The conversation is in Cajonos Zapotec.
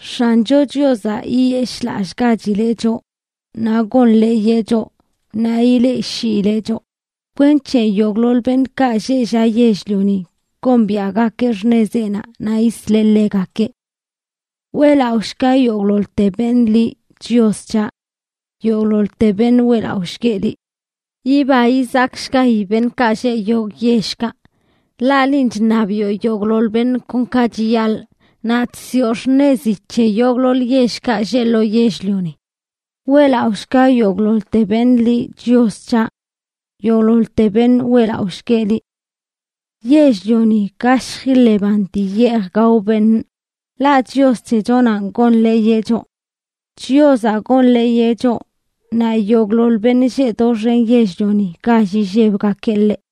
X̱ancho Chiozaꞌ yiyeshꞌlallꞌgachileꞌ choꞌ, naꞌ gonḻeeyeꞌ choꞌ, naꞌ ileꞌshiileꞌ choꞌ, kwenc̱he yogꞌḻoḻ beṉꞌkaꞌ lleꞌ llaꞌ yell-lioni gombiaꞌgakeꞌ xṉezeꞌnaꞌ naꞌ yisleꞌ ḻegakeꞌ. ¡Weꞌlaꞌoshga yogꞌḻoḻte beṉꞌ liꞌ, Chios c̱haꞌ! ¡Yogꞌḻoḻte beṉꞌ weꞌlaꞌoshgueꞌ liꞌ! Yiba yizakshgayi beṉꞌkaꞌ lleꞌ yogꞌ yellkaꞌ, ḻaꞌ linꞌ chṉabiꞌo yogꞌḻoḻ beṉꞌ kon ka chiyaḻꞌ, naꞌ chsiꞌo xṉezi c̱he yogꞌḻoḻ yellkaꞌ lleꞌ lo yell-lioni. ¡Weꞌlaꞌoshga yogꞌḻoḻte beṉꞌ liꞌ, Chios c̱haꞌ! ¡Yogꞌḻoḻte beṉꞌ weꞌlaꞌoshgueꞌ liꞌ! Yell-lioni gashj iḻeban dii yeej gao beṉꞌ, ḻaꞌ Chios c̱hechonanꞌ gonḻeeyeꞌ choꞌ. Chiozaꞌ gonḻeeyeꞌ choꞌ, naꞌ yogꞌḻoḻ beṉꞌ lleꞌ doxen yell-lioni gall illebgakeꞌ ḻeꞌ.